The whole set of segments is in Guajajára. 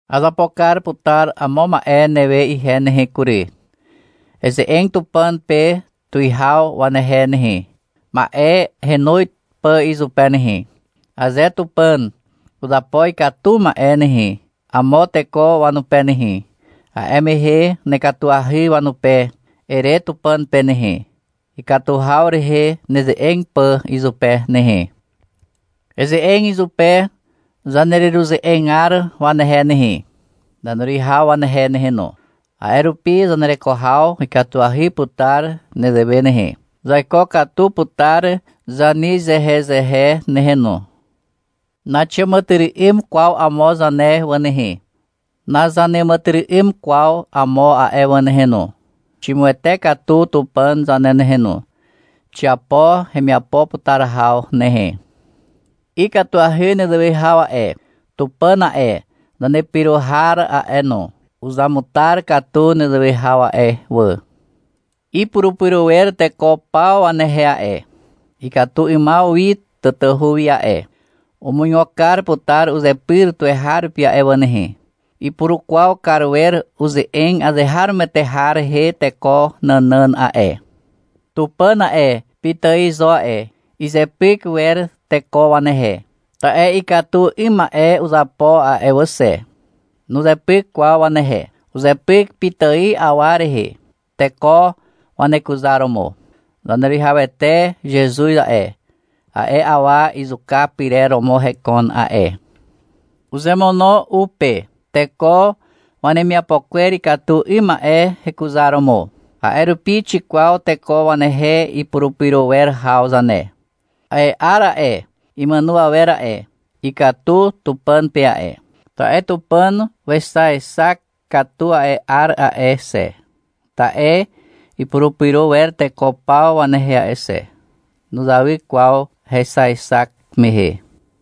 Azapo kar putar amo ma'e newe ihe nehe kury. — Eze'eg Tupàn pe tuwihaw wanehe nehe, ma'e henoz pà izupe nehe. Aze Tupàn uzapo ikatu ma'e nehe, amo teko wanupe nehe, a'e mehe — Nekatuahy wanupe, ere Tupàn pe nehe, ikatu haw rehe neze'eg pà izupe nehe. Eze'eg izupe zanereruze'egar wanehe nehe, zaneruwihaw wanehe nehe no. A'e rupi zanereko haw ikatuahy putar zanewe nehe. Zaiko katu putar zanezehezehe nehe no. Naxiàmàtyry'ym kwaw amo zane wà nehe, nazaneàmàtyry'ym kwaw amo a'e wà nehe no. Ximuwete katu Tupàn zane nehe no. Xiapo hemiapo putar haw nehe. Ikatuahy nezewe haw a'e, Tupàn a'e, zanepyro har a'e no, uzamutar katu nezewe haw a'e wà. Ipurupyro wer teko paw wanehe a'e, katu 'ymaw wi tatahu wi a'e. Umuigo kar putar uzepyr tuweharupi a'e wà nehe. Ipurukwaw kar wer uze'eg azeharomoete har rehe teko nànàn a'e. Tupàn a'e, pitài zo a'e. Izepyk wer teko wanehe, ta'e ikatu 'ym ma'e uzapo a'e wà xe. Nuzepyk kwaw wanehe. Uzepyk pitài awa rehe, teko wanekuzaromo. Zaneruwihawete Zezuz a'e, a'e awa izuka pyrer romo hekon a'e. Uzemono u pe, teko wanemiapo kwer ikatu 'ym ma'e hekuzaromo. A'e rupi xikwaw teko wanehe ipurupyro wer haw zane. A'e 'ar a'e, imàno awer a'e, ikatu Tupàn pe a'e. Ta'e Tupàn wexaexak katu a'e 'ar a'e xe. Ta'e ipurupyro wer teko paw wanehe a'e xe. Nuzawy kwaw hexaexak mehe.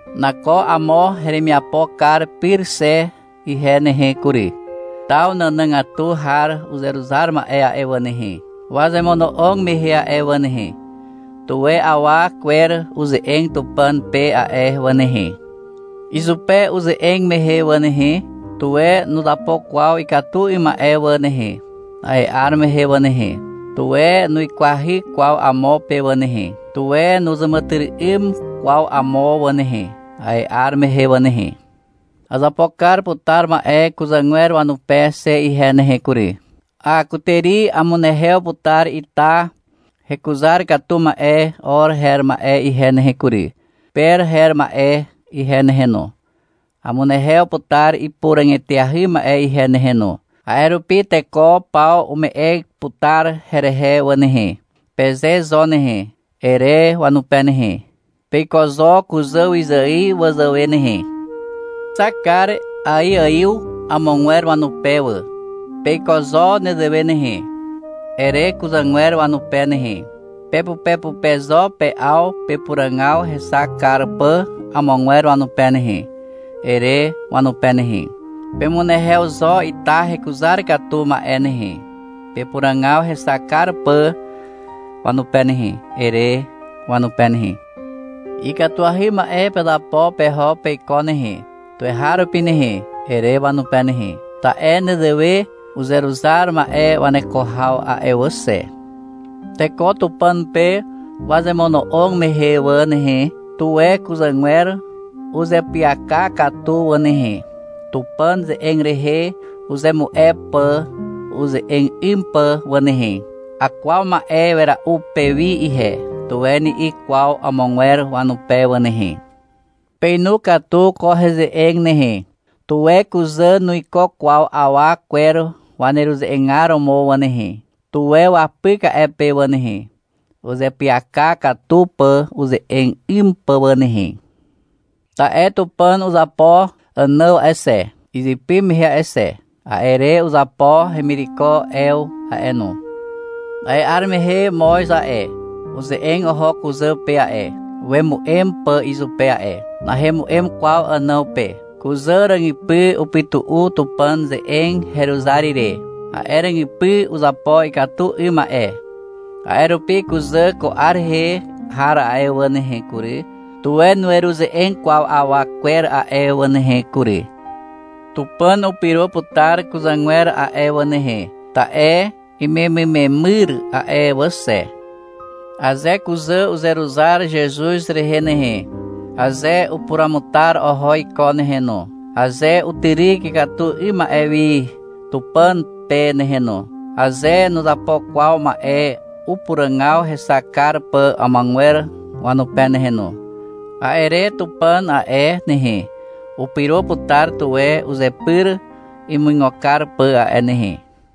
Nako amo heremiapo kar pyr xe ihe nehe kury. Taw nànàgatu har uzeruzar ma'e a'e wà nehe, wazemono'og mehe a'e wà nehe, tuwe awa kwer uze'eg Tupàn pe a'e wà nehe. Izupe uze'eg mehe wà nehe, tuwe nuzapo kwaw ikatu 'ym ma'e wà nehe, a'e 'ar mehe wà nehe. Tuwe nuikwahy kwaw amo pe wà nehe. Tuwe nuzàmàtyry'ym kwaw amo wà nehe, a'e 'ar mehe wà nehe. Azapo kar putar ma'e kuzàgwer wanupe xe ihe nehe kury. — A, kutàri amunehew putar ita hekuzar katu ma'e or her ma'e ihe nehe kury, per her ma'e ihe nehe no, amunehew putar ipuràg eteahy ma'e ihe nehe no, a'e rupi teko paw ume'e putar herehe wà nehe, peze zo nehe, ere wanupe nehe. — Peiko zo kuzàwyzài wazàwe nehe. Uzexak kar aiaiw amogwer wanupe wà. Peiko zo nezewe nehe, ere kuzà wanupe nehe. — Pepupepupe zo pe'aw pepuràgaw hexak kar pà amogwer wanupe nehe, ere wanupe nehe. — Pemunehew zo ita hekuzar katu ma'e nehe, pepuràgaw hexak kar pà wanupe nehe, ere wanupe nehe. Ikatuahy ma'e pezapo peho peiko nehe, tuweharupi nehe, ere wanupe nehe. Ta'e nezewe uzeruzar ma'e waneko haw a'e wà xe. Teko Tupàn pe wazemono'og mehe wà nehe, tuwe kuzàgwer uzeapyaka katu wà nehe, Tupàn ze'eg rehe uzemu'e pà uze'eg 'ym pà wà nehe. — Akwaw ma'e wera'u pewi ihe, tuwe ni'i kwaw amogwer wanupe wà nehe. Peinu katu ko heze'eg nehe. Tuwe kuzà nuiko kwaw awa kwer waneruze'egar romo wà nehe. Tuwe wapyk a'e pe wà nehe, uzeapyaka katu pà uze'eg 'ym pà wà nehe. Ta'e Tupàn uzapo Ànàw a'e xe, izypy mehe a'e xe. A'e re uzapo hemireko Ew a'e no. A'e 'ar mehe moz a'e, uze'eg oho kuzà pe a'e, wemu'em pà izupe a'e. Nahemu'em kwaw Ànàw pe. Kuzà ràgypy upytu'u Tupàn ze'eg heruzar ire. A'e ràgypy uzapo ikatu 'ym ma'e. A'e rupi kuzà ko 'ar rehe har a'e wà nehe kury, tuwe nueruze'eg kwaw awa kwer a'e wà nehe kury. Tupàn upyro putar kuzàgwer a'e wà nehe, ta'e imemymemyr a'e wà xe. Aze kuzà uzeruzar Zezuz rehe nehe, aze upuruamutar oho iko nehe no, aze utyryk ikatu 'ym ma'e wi Tupàn pe nehe no, aze nuzapo kwaw ma'e upuràgaw hexak kar pà amogwer wanupe nehe no, a'e re Tupàn a'e nehe, upyro putar tuwe uzepyr imuigo kar pà a'e nehe.